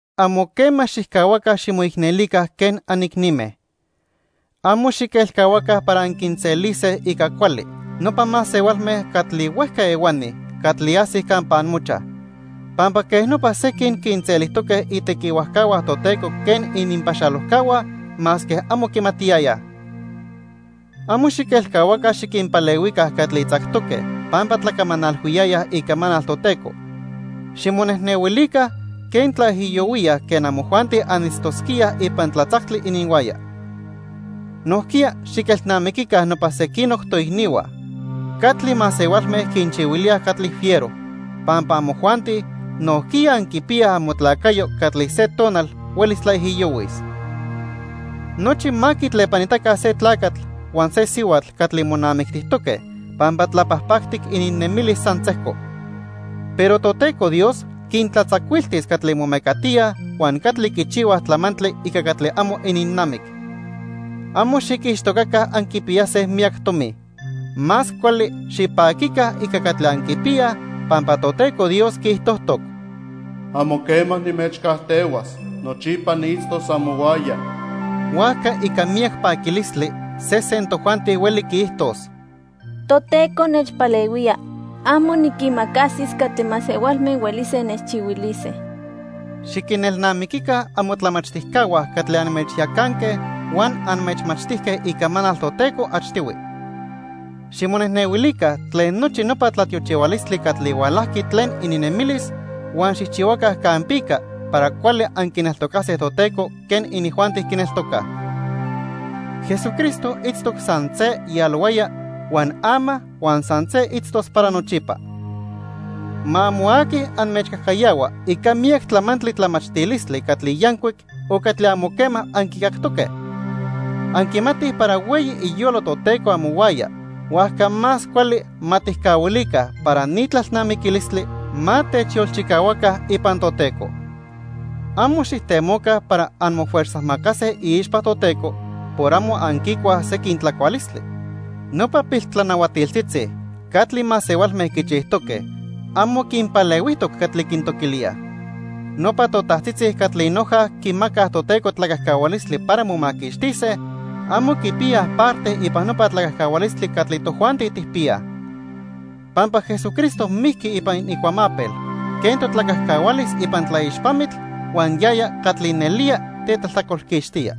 Amo quema xijcahuaca ximoicnelica quen anicnime. Amo xiquelcahuaca para anquinselise ica cuali, nopa masehualme catli huejca ehuani catli ajsij campa amochaj, pampa quej nopa sequin quinselijtoque itequihuajcahua Toteco quen ininpaxalojcahua masque amo quimatiyayaj. Amo xiquelcahuaca xiquinpalehuica catli tzactoque pampa tlacamanalhuiyayaj icamanal Toteco. Ximonejnehuilica quen tlaijiyohuíaj quen amojuanti anitztosquíaj ipan tlatzactli ininhuaya. Nojquiya xiquinelnamiquica nopa sequinoc toicnihua catli masehualme quinchihuilíaj catli fiero, pampa amojuanti nojquiya anquipiyaj amotlacayo catli se tonal huelis tlaijiyohuis. Nochi ma quitlepanitaca se tlacatl huan se sihuatl catli monamictijtoque pampa tlapajpactic ininnemilis san sejco. Pero Toteco Dios quintlatzacuiltis catli momecatíaj huan catli quichihuaj tlamantli ica catli amo ininnamic. Amo xiquixtocaca anquipiyase miyac tomi. Más cuali xipaquica ica catli anquipiyaj pampa Toteco Dios quiijtojtoc: "Amo quema nimechcajtehuas, nochipa niitztos amohuaya." Huajca ica miyac paquilistli sesen tojuanti hueli quiijtos: "Toteco nechpalehuía. Amo niquimacasis catli masehualme huelise nechchihuilise." Xiquinelnamiquica amotlamachtijcahua catli anmechyacanque huan anmechmachtijque Icamanal Toteco achtihui. Ximonejnehuilica tlen nochi nopa tlatiochihualistli catli hualajqui tlen ininnemilis huan xijchihuaca campica para cuali anquineltocase Toteco quen inijuanti quineltocaj. Jesucristo itztoc san se yalohuaya huan ama huan san se itztos para nochipa. Ma amo aqui anmechcajcayahua ica miyac tlamantli tlamachtilistli catli yancuic o catli amo quema anquicactoque. Anquimatij para hueyi iyolo Toteco amohuaya huajca más cuali ma tijcahuilica para ni tlalnamiquilistli ma techyolchicahuaca ipan Toteco. Amo xijtemoca para anmofuerzajmacase iixpa Toteco por amo anquicuaj sequin tlacualistli. Nopa piltlanahuatiltzitzi catli masehualme quichijtoque amo quinpalehuijtoc catli quintoquilíaj. Nopa totajtzitzi catli noja quimacaj Toteco tlacajcahualistli para momaquixtise, amo quipiyaj parte ipan nopa tlacajcahualistli catli tojuanti tijpiyaj. Pampa Jesucristo mijqui ipan icuamapel quen totlacajcahualis ipan tlaixpamitl huan yaya catli nelía tetlajtlacolquixtía.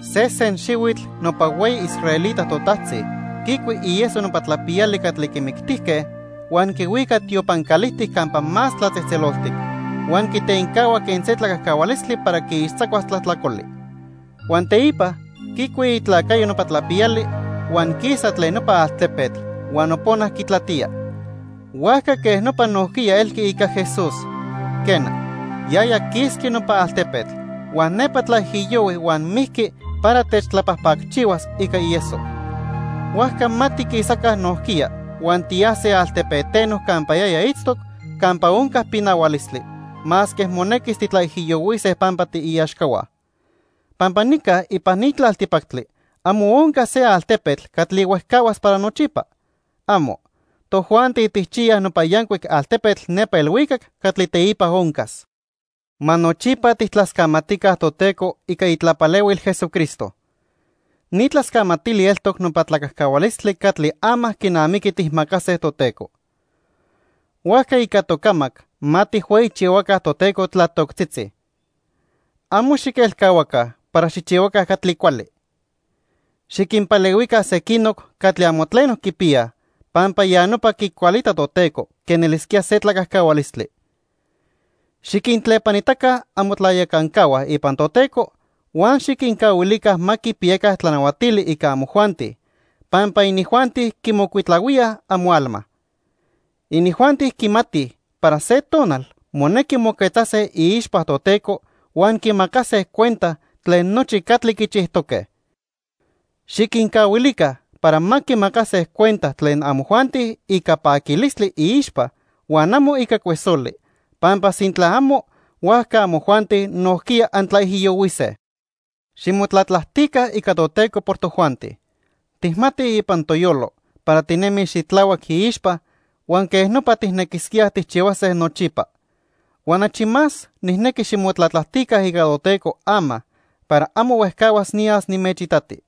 Sesen xihuitl nopa hueyi israelita totajtzi quicui ieso nopa tlapiyali catli quimictijque huan quihuica tiopan calijtic Campa Más Tlatzejtzeloltic huan quitencahua quen se tlacajcahualistli para quiixtzacuas tlajtlacoli. Huan teipa quicui itlacayo nopa tlapiyali huan quisa tlen nopa altepetl huan nopona quitlatía. Huajca quej nopa nojquiya elqui ica Jesús. Quena, yaya quisqui nopa altepetl huan nepa tlaijiyohui huan mijqui para tetlapajpacchihuas ica ieso. Huajca ma tiquisaca nojquiya huan tiyase altepeteno campa yaya itztoc campa onca pinahualistli, masque monequis titlaijiyohuise pampa tiiaxcahua. Pampa nica ipan ni tlaltipactli amo onca se altepetl catli huejcahuas para nochipa. ¡Amo! Tojuanti tijchiyaj nopa yancuic altepetl nepa ilhuicac catli teipa oncas. Ma nochipa tijtlascamatica Toteco ica itlapalehuil Jesucristo. Ni tlascamatili eltoc nopa tlacajcahualistli catli ama quinamiqui tijmacase Toteco. Huajca ica tocamac ma tijhueyichihuaca Toteco tlatoctzitzi. Amo xiquelcahuaca para xijchihuaca catli cuali. Xiquinpalehuica sequinoc catli amo tleno quipiyaj, pampa ya nopa quicualita Toteco quen elisquía se tlacajcahualistli. Xiquintlepanitaca amotlayacancahua ipan Toteco huan xiquincahuilica ma quipiyaca tlanahuatili ica amojuanti, pampa inijuanti quimocuitlahuíaj amoalma. Inijuanti quimatij para se tonal monequi moquetzase iixpa Toteco huan quimacase cuenta tlen nochi catli quichijtoque. Xiquincahuilica para ma quimacase cuenta tlen amojuanti ica paquilistli iixpa huan amo ica cuesoli, pampa sintla amo, huajca amojuanti nojquiya antlaijiyohuise. Ximotlatlajtica ica Toteco por tojuanti. Tijmatij ipan toyolo para tinemij xitlahuac iixpa huan quej nopa tijnequisquíaj tijchihuase nochipa. Huan achi más nijnequi ximotlatlajtica ica Toteco ama para amo huejcahuas niyas nimechitati.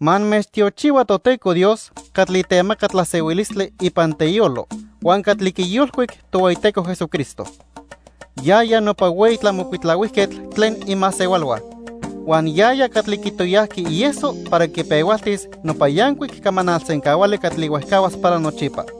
Ma anmechtiochihua Toteco Dios catli temaca tlasehuilistli ipan teyolo huan catli quiyolcuic Tohueyiteco Jesucristo. Yaya nopa hueyi tlamocuitlahuijquetl tlen imasehualhua. Huan yaya catli quitoyajqui ieso para quipehualtis nopa yancuic camanal sencahuali catli huejcahuas para nochipa.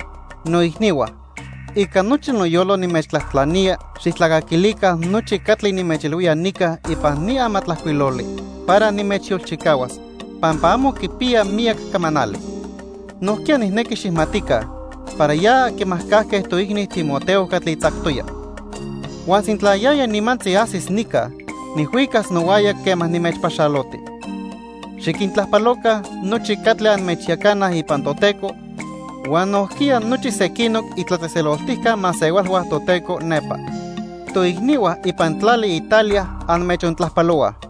Noicnihua, ica nochi noyolo nimechtlajtlanía xijtlacaquilica nochi catli nimechilhuía nica ipan ni amatlajcuiloli para nimechyolchicahuas, pampa amo quipiya miyac camanali. Nojquiya nijnequi xijmatica para ya quimajcajque toicni Timoteo catli tzactoya. Huan sintla yaya nimantzi ajsis nica, nijhuicas nohuaya quema nimechpaxaloti. Xiquintlajpaloca nochi catli anmechyacanaj ipan Toteco huan nojquiya nochi sequinoc itlatzejtzeloltijca masehualhua Toteco nepa. Toicnihua ipan tlali Italia anmechontlajpalohuaj.